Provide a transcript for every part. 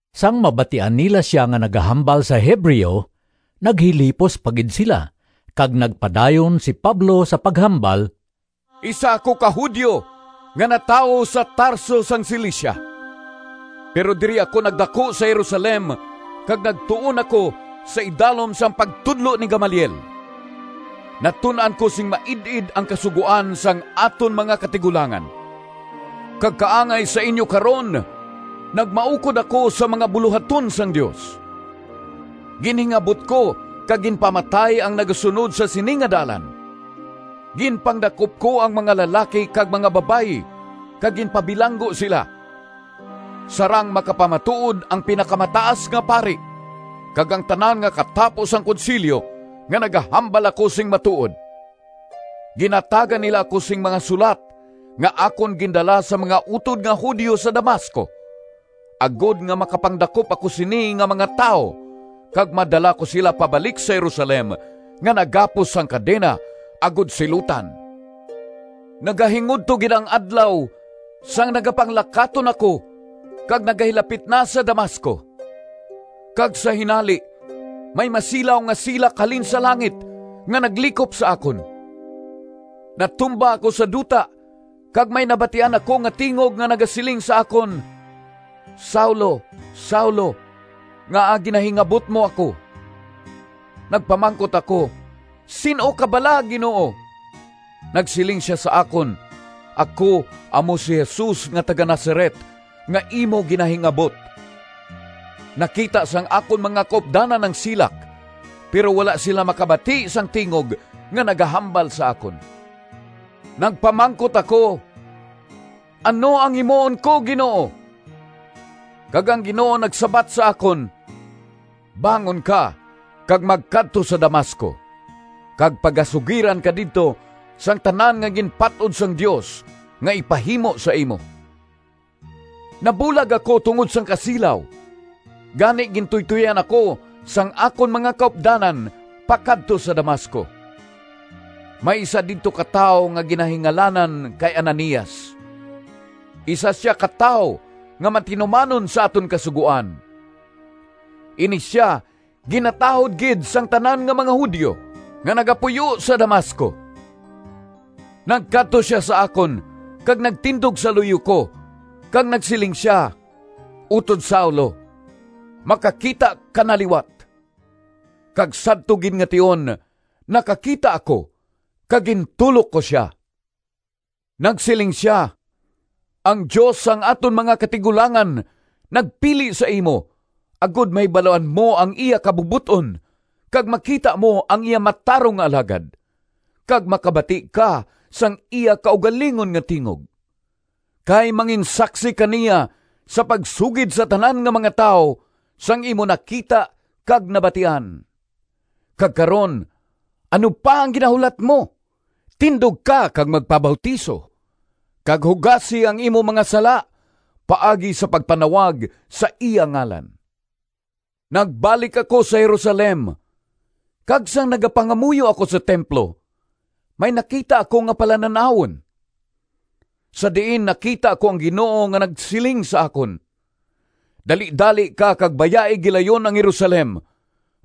Sang mabatian nila sia nga nagahambal sa Hebreo, naghilipos pa gid sila kag nagpadayon si Pablo sa paghambal: “Isa ako ka Judio nga natawo sa Tarso sang Cilicia, pero diri ako nagdaku sa Jerusalem kag nagtuon ako sa idalom sang pagtudlo ni Gamaliel. Natun-an ko sing maid-id ang Kasugoan sang aton mga katigulangan, kag kaangay sa inyo karon nagmaukod ako sa mga bulohaton sang Dios. Ginhingabot ko kag ginpamatay ang nagasunod sa sini nga Dalan. Ginpangdakop ko ang mga lalaki kag mga babayi kag ginpabilanggo sila. Sarang makapamatuod ang Pinakamataas nga Pari kag ang tanan nga katapo sang Konsilyo nga nagahambal ako sing matuod. Ginhatagan nila ako sing mga sulat nga akon gindala sa mga utod nga Judio sa Damasco agod nga makapangdakop ako sini nga mga tawo kag madala ko sila pabalik sa Jerusalem nga nagapos sang kadena agod silutan.” “Nagahingudto gid ang adlaw sang nagapanglakaton ako kag nagahilapit na sa Damasco, kag sa hinali may masilaw nga silak halin sa langit nga naglikop sa akon. Natumba ako sa duta kag may nabatian ako nga tingog nga nagasiling sa akon, ‘Saulo, Saulo! Ngaa ginahingabot mo ako?’ Nagpamangkot ako, ‘Sin-o ka bala, Ginoo?’ Nagsiling sia sa akon, ‘Ako amo si Jesus nga taga-Nazaret, nga imo ginahingabot.’ Nakita sang akon mga kaupdanan ang silak, pero wala sila makabati sang tingog nga nagahambal sa akon. Nagpamangkot ako, ‘Ano ang himuon ko, Ginoo?’ kag ang Ginoo nagsabat sa akon, ‘Bangon ka kag magkadto sa Damasco, kag pagasugiran ka didto sang tanan nga ginpat-od sang Dios nga ipahimo sa imo.’ Nabulag ako tungod sang kasilaw, gani gintuytoyan ako sang akon mga kaupdanan pakadto sa Damasco. “May isa didto ka tawo nga ginahingalanan kay Ananias. Isa sia ka tawo nga matinumanon sa aton Kasugoan. Ini sia ginatahod gid sang tanan nga mga Judio nga nagapuyo sa Damasco. Nagkadto sia sa akon kag nagtindog sa luyo ko kag nagsiling sia, ‘Utod Saulo, makakita ka na liwat!’ Kag sadto gid nga tion nakakita ako kag gintulok ko sia. Nagsiling sia, ‘Ang Dios sang aton mga katigulangan nagpili sa imo agod mahibaluan mo ang iya kabubot-on, kag makita mo ang iya matarong nga Alagad, kag makabati ka sang iya kaugalingon nga tingog. Kay manginsaksi ka niya sa pagsugid sa tanan nga mga tawo sang imo nakita kag nabatian. Kag karon, ano pa ang ginahulat mo? Tindog ka kag magpabautiso, kag hugasi ang imo mga sala paagi sa pagpanawag sa iya ngalan.’” “Nagbalik ako sa Jerusalem kag sang nagapangamuyo ako sa templo, may nakita ako nga palanan-awon, sa diin nakita ko ang Ginoo nga nagsiling sa akon, ‘Dalidali ka kag bayai gilayon ang Jerusalem,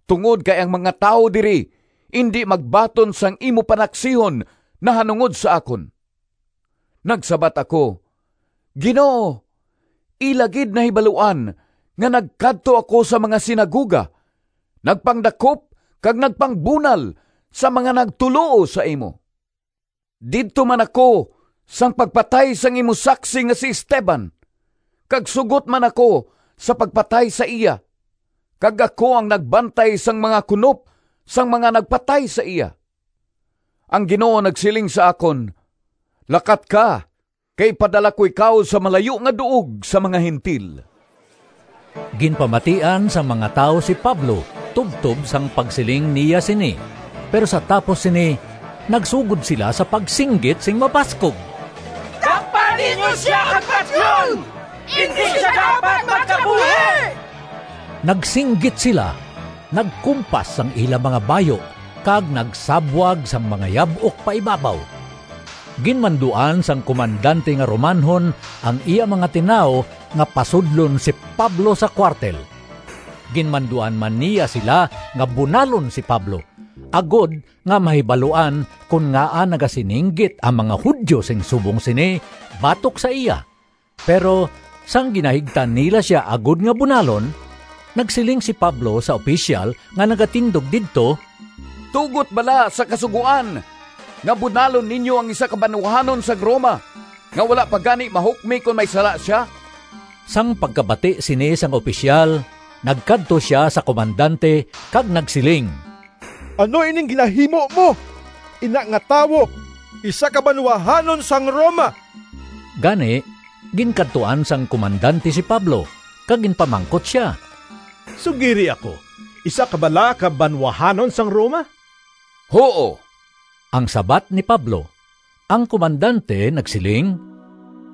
tungod kay ang mga tawo diri indi magbaton sang imo panaksihon nahanungod sa akon.’ Nagsabat ako, ‘Ginoo, ila gid nahibaluan nga nagkadto ako sa mga sinagoga, nagpangdakop kag nagpangbunal sa mga nagtuloo sa imo. Didto man ako sang pagpatay sang imo saksi nga si Esteban kag sugot man ako sa pagpatay sa iya kag ako ang nagbantay sang mga kunop sang mga nagpatay sa iya.’ Ang Ginoo nagsiling sa akon, ‘Lakat ka, kay ipadala ko ikaw sa malayo nga duog sa mga Gentil.’” Ginpamatian sang mga tawo si Pablo tubtob sang pagsiling niya sini. Pero sa tapos sini nagsugod sila sa pagsinggit sing mabaskog, “Dakpa ninyo sia kag patyon! Indi sia dapat magkabuhi!” Nagsinggit sila, nagkumpas sang ila mga bayu kag nagsabwag sang mga yab-ok paibabaw. Ginmanduan sang komandante nga Romanhon ang iya mga tinawo nga pasudlon si Pablo sa kuwartel. Ginmanduan man niya sila nga bunalon si Pablo, agod nga mahibaluan kon ngaa nagasininggit ang mga Judio sing subong sini batok sa iya. Pero sang ginahigtan nila sia agod nga bunalon, nagsiling si Pablo sa opisyal nga nagatindog didto, “Tugot bala sa kasugoan nga bunalon ninyo ang isa ka banwahanon sang Roma nga wala pa gani mahukmi kon may sala sia?” Sang pagkabati sini sang opisyal, nagkadto sia sa komandante kag nagsiling, “Ano ining ginahimo mo? Ina nga tawo isa ka banwahanon sang Roma!” Gani, ginkadtuan sang komandante si Pablo kag ginpamangkot sia, “Sugiri ako, isa ka bala ka banwahanon sang Roma?” “Huo,” ang sabat ni Pablo. Ang komandante nagsiling,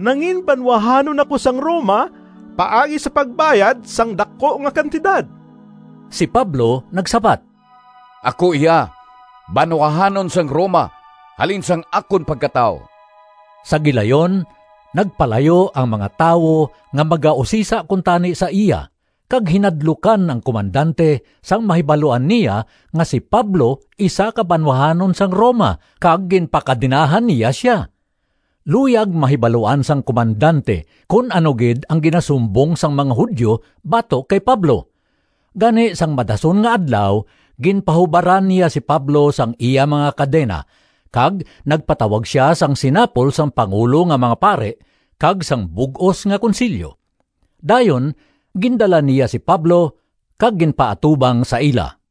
“Nanginbanwahanon ako sang Roma paagi sa pagbayad sang daku nga kantidad.” Si Pablo nagsabat, “Ako iya banwahanon sang Roma halin sang akon pagkatawo.” Sa gilayon nagpalayo ang mga tawo nga magausisa kuntani sa iya kag hinadlukan ang komandante sang mahibaluan niya nga si Pablo isa ka banwahanon sang Roma kag ginpakadenahan niya sia. Luyag mahibaluan sang komandante kon ano gid ang ginasumbong sang mga Judio batok kay Pablo. Gani sang madason nga adlaw ginpahubaran niya si Pablo sang iya mga kadena kag nagpatawag sia sang sinapol sang pangulo nga mga pari kag sang bug-os nga Konsilyo. Dayon gindala niya si Pablo kag ginpaatubang sa ila.